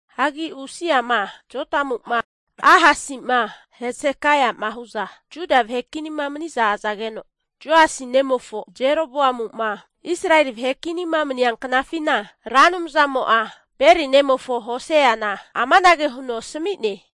Hagi Usia'ma, Jotamu'ma, Ahasi'ma Hesekaia'ma hu'za Juda vahe kinima mani'za azageno, Joasi nemofo Jeroboamu'ma Israeli vahe kinima mani'nea knafina Ra Anumzamo'a Beri nemofo Hoseana amanage huno asami'ne.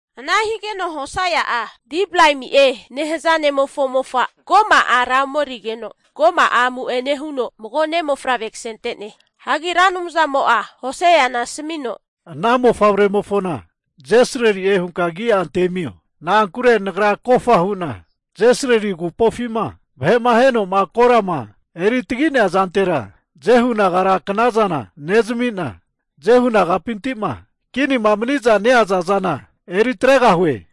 Ana higeno Hosea'a Diblaimi'e nehaza ne'mofo mofa Goma ara omerigeno, Goma'a amu'ene huno mago ne' mofavre kasente'ne. Hagi Ra Anumzamo'a Hoseana asamino, Ana mofavremofona Jesrili'e hunka agi'a antemio. Na'ankure Nagra kofta hu'na Jesrili agupofima vahe'ma aheno'ma korama eri tagi'nea zantera, Jehu nagara knazana nezmi'na, Jehu nagapinti'ma kinima mani'za neaza zana eri atregahue.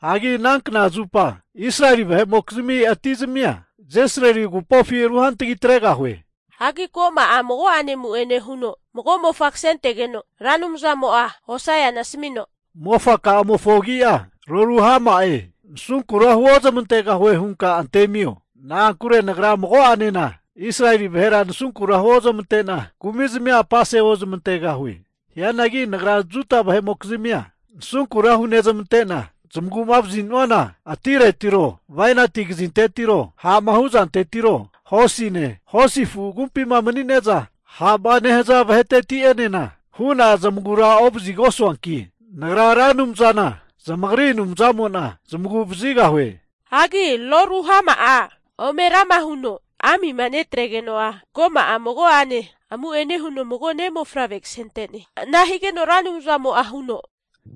Hagi ana knazupa Israeli vahe'mokizmi ati zamia Jesrili agupofi ruhantagi atregahue. Hagi Goma'a mago'ane amu'ene huno mago mofa kasentegeno, Ra Anumzamo'a Hoseana asamino, Mofaka'amofo agia, Lo-Ruhama'e, nasunkura huozmantegahue hunka antemio. Na'ankure Nagra mago'enena Israeli vahera nasunkura huozmante'na kumizmi'a apase ozmantegahue. Hianagi Nagra Juda vahe'mokizmia nasunkura hunezmante'na, zamagu'ma vazinuana atiretiro, bainati kazintetiro, ha'ma hu'zantetiro, hosine, hosi afu agumpima mani'neza ha'ma nehaza vaheteti'enena hu'na zamagura ovazigosuanki, Nagra Ra Anumzana zamagri Anumzamo'na zamagu'vazigahue. Hagi Lo-Ruhama'a ome rama huno amima netregeno'a, Goma'a mago'ane amu'ene huno mago ne' mofavre kasente'ne. Ana higeno Ra Anumzamo'a huno,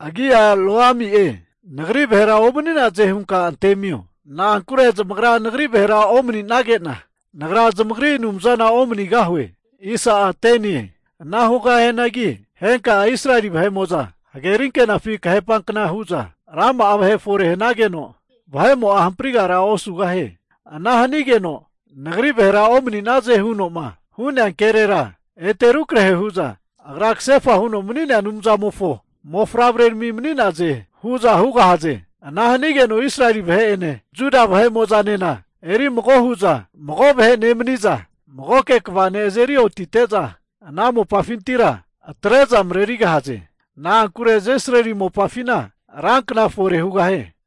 Agi'a Lo-Ami'e, nagri vahera omani'naze hunka antemio. Na'ankure zamagra nagri vahera omani'nage'na, Nagra zamagri Anumzana omanigahue. Ana hugahianagi henka'a Israeli vahe'mo'za hageri anke'nafi kahepankna hu'za rama'a vahe fore hanageno, vahe'mo'a hamprigara osugahie. Ana hanigeno, Nagri vahera omani'naze huno'ma hu'nea kerera, ete rukrahe hu'za Agra kasefa huno mani'nea Anumzamofo mofavrerami mani'naze hu'za hugahaze. Ana hanigeno Israeli vahe'ene Juda vahe'mo'zanena eri mago hu'za mago vahe nemaniza, magoke kva ne' azeri otite'za, ana mopafintira atre'za marerigahaze. Na'ankure Jesrili mopafina rankna fore hugahie.